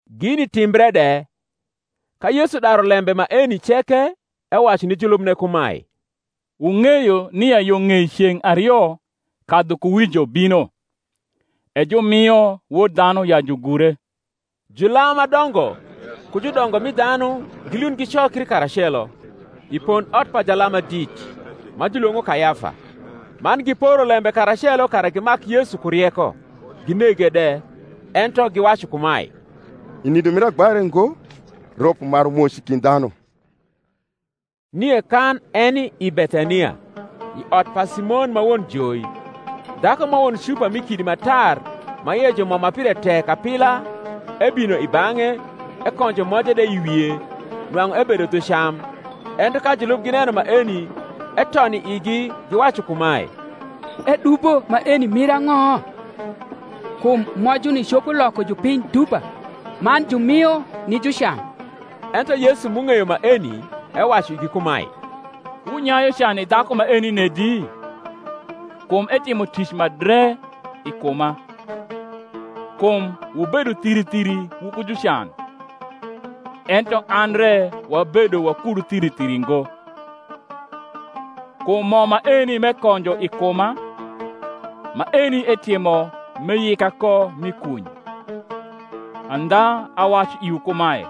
Gini timbre de, ka Yesu daru lembe maeni ceke, ewacu ni julubne kumae, Wung’eyo nia yo ng’ei ceng’ ario kadhukuwijo bino, e jumio Wod dhanu ya jugure. Julam ma dongo ku judongo mi dhanu gilund gicokri karacelo, i pondot pa jalam ma dit, ma julwong’o Kayafa; man giporo lembe karacelo kara gimak Yesu ku rieko, ginege de. Ento giwacu kumae, I nindo mir agba re ngo, rop umaru moc i kind dhanu. Nie kan eni i Bethania, i ot pa Simon ma won joi, dhaku ma won cupa mi kidi ma tar ma ie ju mo ma pire tek apila, ebino i bang’e, ekonjo moje de i wie, nwang’u ebedo dhu cam. Ento ka julub gineno maeni, eton i igi, giwacu kumae, Edubo maeni mir ang’o? Kum mojuni copo loko jupiny dupa, man jumio ni jucan. Ento Yesu m’ung’eyo maeni ewacu igi kumae, Wunyayu can i dhaku maeni nedi? kum etimo tic ma dre i kuma. Kum wubedo thiri thiri wuku jucan; ento an re wabedo wakudu thiri thiri ngo. Kum mo maeni m’ekonjo i kuma, maeni etimo m’eyika ko mi kuny. Andha awacu iwu kumae,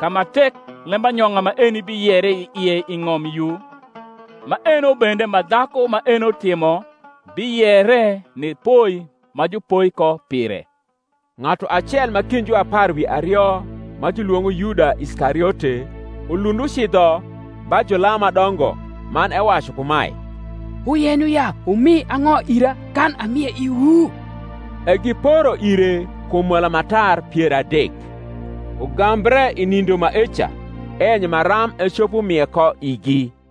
Ka ma tek lembanyong’a maeni biyere i ie i ng’om yu, maeno bende ma dhaku maeno timo biyere ni poi ma jupoi ko pire. Ng’atu acel m’i kind juapar wi ario, ma julwong’o Yuda Iskariote, ulund ucidho ba julam ma dongo, man ewacu kumae, Wuyenyo ya wumi ang’o ira kan amie iwu? E giporo ire kum mola ma tar pier adek. Ugambre i nindo maeca eyenyo maram ecopo mie ko igi.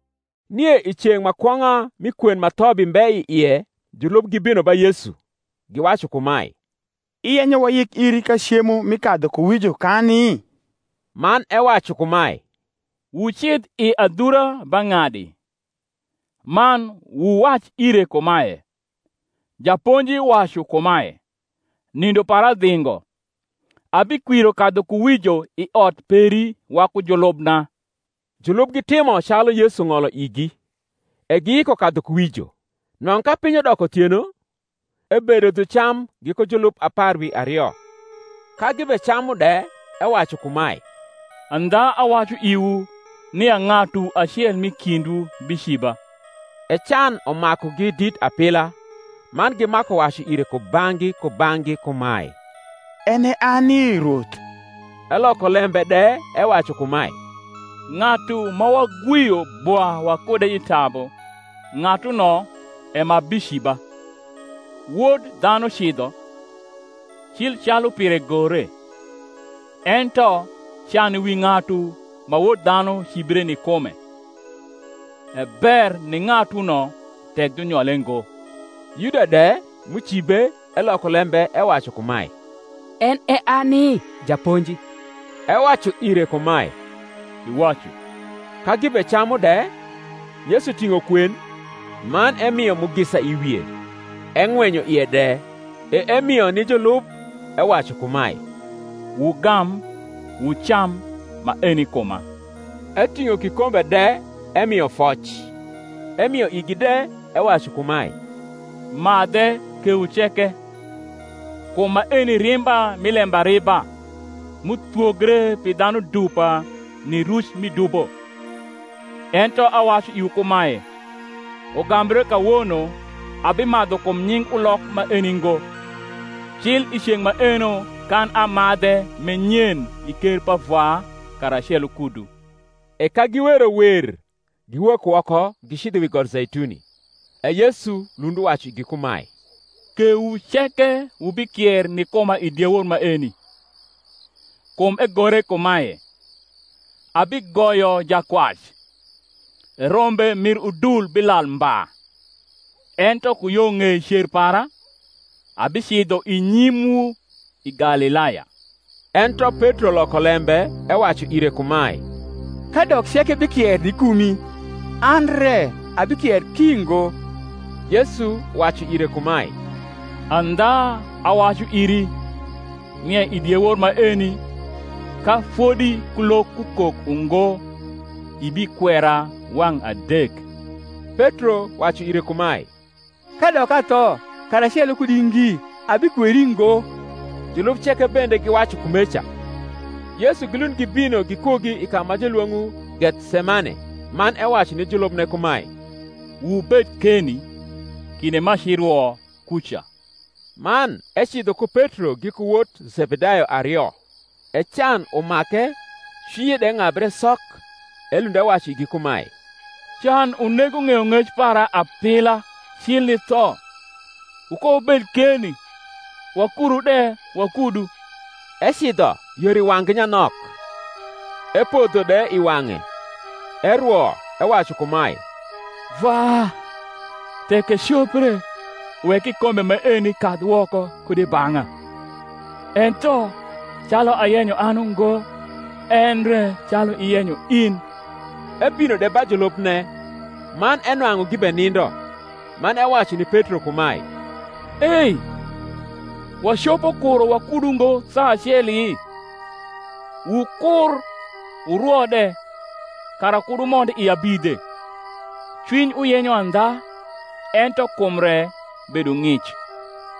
Nie i ceng’ ma kwong’a mi kwen ma thobi mbe i ie julub gibino ba Yesu, giwacu kumae, Iyenyo wayik iri ka cemo mi kadhukuwijo kani? Man ewacu kumae, Wucidh i adhura ba ng’adi, man wuwac ire kumae, Japonji wacu kumae, Nindo para dhingo; abikwiro kadhukuwijo i ot peri waku julubna. Julub gitimo calu Yesu ng’olo igi; e giyiko kadhukuwijo. Nwang’u ka piny udoko uthieno, ebedo dhu cam giku julub apar wi ario; ka gibecamu de, ewacu kumae, Andha awacu iwu, nia ng’atu acel m’i kindwu biciba. E can umakugi dit apila, man gimaku wacu ire kubang’gi kubang’gi kumae, En e ani, Rwoth? Eloko lembe de ewacu kumae, Ng’atu ma wagwio bwa wakude i tabu, ng’atuno e ma biciba. Wod dhanu cidho, cil calu pire gore: ento can wi ng’atu ma Wod dhanu cibre ni kume! E ber ni ng’atuno tek junyole ngo. Yuda de, m’ucibe, eloko lembe ewacu kumae, En e ani, Japonji? Ewacu ire kumae, Iwacu. Ka gibecamu de, Yesu ting’o kwen, man emio mugisa i wie, eng’wenyo ie de; e emio ni julub, ewacu kumae, Wugam, wucam; maeni kuma. Eting’o kikombe de, emio foc, emio igi de, ewacu kumae, Madhe kewu ceke; kum maeni rimba mi lembariba, m’uthwogre pi dhanu dupa ni ruc mi dubo. Ento awacu iwu kumae, Ugambre kawono abimadhu kum nying ulok maeni ngo, cil i ceng’ maeno kan amadhe m’e nyen i ker pa Vwa karacelo kudu. E ka giwero wer, giwok woko gicidho wi got Zeituni. E Yesu lund uwacu igi kumae, Kewu ceke wubikier ni kuma i diewor maeni: kum egore kumae, Abigoyo jakwac, e rombe mir udul bilal mba. Ento ku yo ng’ei cer para, abicidho i nyimwu i Galilaya. Ento Petro loko lembe ewacu ire kumae, Kadok ceke bikier ni kumi, an re abikier ki ngo. Yesu wacu ire kumae, Andha awacu iri, nia i diewor maeni, ka fodi kulok kukok ungo, ibikwera wang’ adek. Petro wacu ire kumae, Kadok atho karacelo kudi ngi, abikweri ngo. Julub ceke bende giwacu kumeca. Yesu gilund gibino gikugi i ka ma julwong’o Gethsemane man ewacu ni julubne kumae, Wubed keni, kinde m’aci rwo kuca. Man ecidho ku Petro giku wot Zebedayo ario, e can umake cwinye de ng’abre sok. Elund ewacu igi kumae, Can unego ng’eyong’ec para apila, cil ni tho: wukowubed keni, wakuru de wakudu. Ecidho yor i wang’gi nyanok, epodho de i wang’e, erwo, ewacu kumae, Vwa, tek ecopre, wek kikombe maeni kadh woko kud i bang’a: ento, calu ayenyo an ungo, endre calu iyenyo in. Ebino de ba julubne, man enwang’u gibenindo, man ewacu ni Petro kumae, Ei, wacopo kuro wakudu ngo saa aceli? Wukur wurwo de, kara kud wumond i abidhe: cwiny uyenyo andha, ento kum re bedo ng’ic.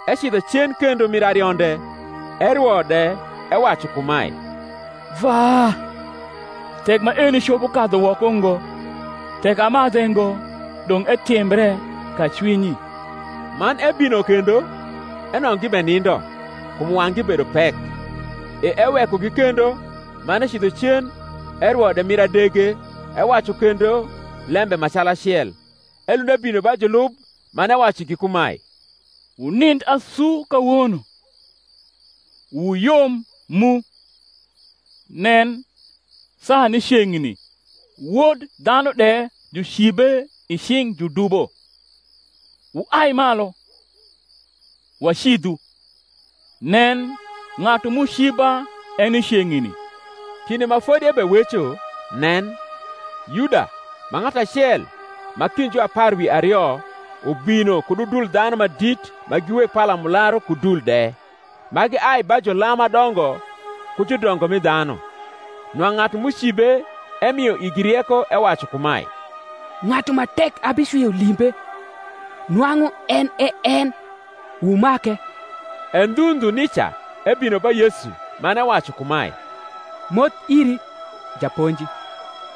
Ecidho cen kendo mir arionde, erwo de, ewacu kumae, Vwa tek maeni copo kadhu woko ngo, tek amadhe ngo, dong’ etimbre kacwinyi. Man ebino kendo, enwang’u gibenindo, kum wang’gi bedo pek. E ewekogi kendo, man ecidho cen, erwo de mir adege, ewacu kendo lembe ma calacel. Elund ebino ba julub, man ewacu igi kumae, Wunind asu kawono, wuyom mu: nen, saa ni ceng’ni, Wod dhanu de jucibe i cing’ judubo. Wuai malu, wacidhu: nen, ng’atu m’uciba eni ceng’ni. Kinde ma fodi ebeweco, nen, Yuda, ma ng’atu acel ma kind juapar wi ario, ubino kud udul dhanu ma dit ma gi weg palamularu ku dul de, ma giai ba julam ma dongo ku judongo mi dhanu. Nwang’u ng’atu m’ucibe emio igi rieko, ewacu kumae, Ng’atu ma tek abicwio limbe, nwang’u en e en: wumake. E ndhu ndhu nica ebino ba Yesu, man ewacu kumae, Moth iri, Japonji;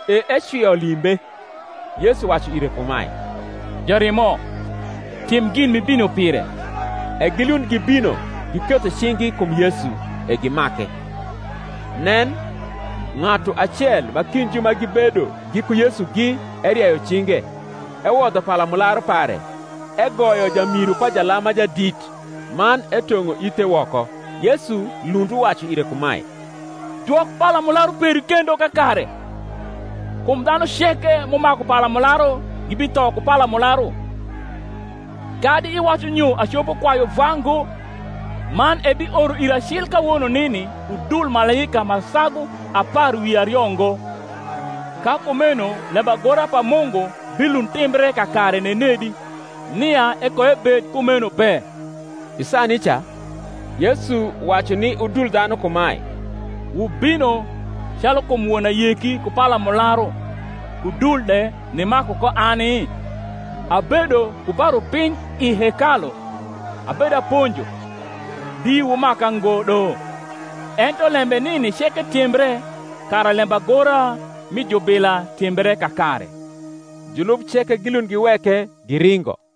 e ecwio limbe. Yesu wacu ire kumae, Jarimo, tim gin m’ibino pire. E gilund gibino giketho cing’gi kum Yesu, e gimake. Nen, ng’atu acel ma kind ju ma gibedo giku Yesugi erieyo cinge, ewodho palamularu pare, egoyo jamiru pa jalam ma jadit, man etong’o ithe woko. Yesu lund uwacu ire kumae, Dwok palamularu peri kendo kakare: kum dhanu ceke m’umaku palamularu gibitho ku palamularu. Kadi iwacu nyo acopo kwayu Vwa ngo, man ebioro ira cil kawono nini udul malaika ma sagu apar wi ario ngo. Ka kumeno lembagora pa Mungu bilund timbre kakare nenedi, nia ekoebed kumeno be. I saa nica Yesu wacu ni udul dhanu kumae, Wubino calu kum won ayeki ku palamularu ku dul de nimaku ko ani? Abedo ku ba rupiny i hekalu abedaponjo, di wumaka ngo do. Ento lembe nini ceke timbre, kara lembagora mi jubila timbre kakare. Julub ceke gilund giweke, giringo.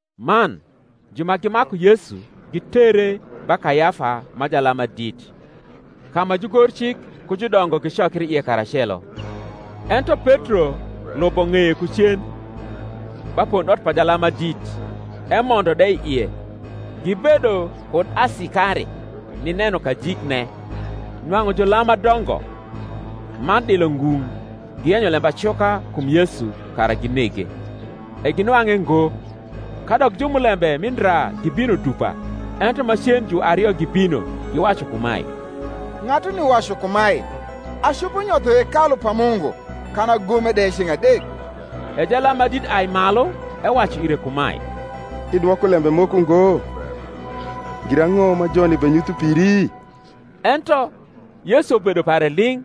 Man ju ma gimaku Yesu gitere ba Kayafa ma jalam ma dit, ka ma jugorcik ku judongo gicokri ie karacelo. Ento Petro lubo ng’eye ku cen, ba pondot pa jalam ma jadit, emondo de i ie, gibedo kud asikari, nineno kajikne. Nwang’u julam ma dongo man dilo ngung’ giyenyo lembacuka kum Yesu, kara ginege; e ginwang’e ngo, kadok jumulembe mi ndra gibino dupa. Ento macen juario gibino, giwacu kumae, Ng’atuni wacu kumae, Acopo nyotho hekalu pa Mungu, kan agome de ceng’ adek. E jalam ma dit uai malu, ewacu ire kumae, Idwoko lembe moko ngo? girang’o ma joni benyutho piri? Ento Yesu bedo pare ling’.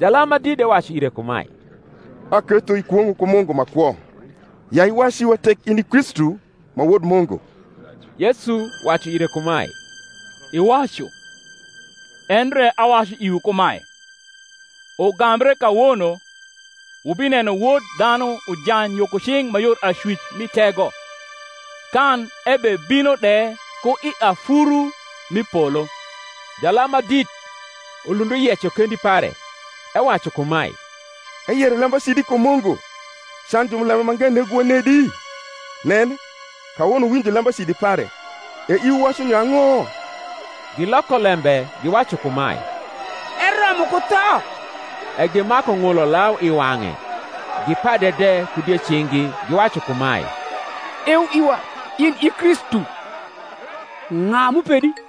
Jalam ma dit de wacu ire kumae, Aketho ikwong’o ku Mungu ma kwo, ya iwac iwa tek in i Kristu, ma Wod Mungu. Yesu wacu ire kumae, Iwacu: endre awacu iwu kumae, Ugambre kawono wubineno Wod dhanu ujany yo ku cing’ ma yor acwic mi Tego, kan ebebino de ku i afuru m’i polo. Jalam ma dit ulund uyeco kendi pare, ewacu kumae, Eyero lembacidi kum Mungu: can jumulembe mange negowa nedi? nen, kawono wuwinjo lembacidi pare: e iwu wacu nyo ang’o? Giloko lembe giwacu kumae, Eromo ku tho. E gimaku ng’ulo lau i wang’e gipade de ku diecing’gi, giwacu kumae, Eu iwa, in i Kristu: ng’a m’upedi?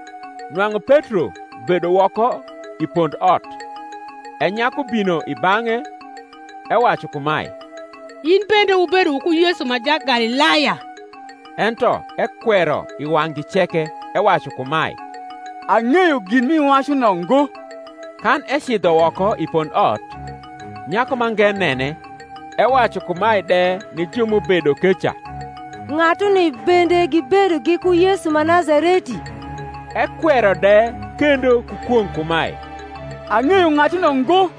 Nwang’u Petro bedo woko i pondot: e nyaku bino i bang’e, ewacu kumae, In bende wubedo wuku Yesu ma Jagalilaya. Ento ekwero i wang’gi ceke, ewacu kumae, Ang’eyo gin m’iwacu no ngo. Kan ecidho woko i pondot, nyaku mange nene, ewacu kumae de ni ju m’ubedo keca, Ng’atuni bende gibedo giku Yesu ma Nazareti. Ekwero de kendo ku kwong’ kumae, Ang’eyo ng’atuno ngo.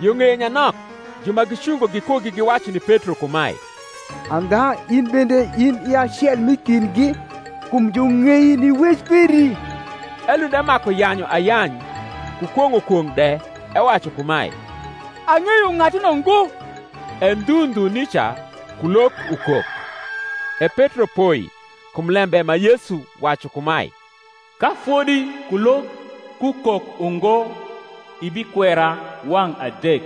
Yo ng’eye nyanok ju ma gicungo gikugi giwacu ni Petro kumae, Andha in bende in i acel m’i kindgi; kum jung’ei ni wec peri. Elund emaku yanyu ayany ku kwong’o kwong’ de, ewacu kumae, Ang’eyo ng’atuno ngo. E ndhu ndhu nica kulok ukok. E Petro poi kum lembe ma Yesu wacu kumae, Ka fodi kulok kukok ungo, ibikwera wang’ adek.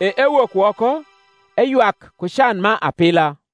E ewok woko, eywak ku can ma apila.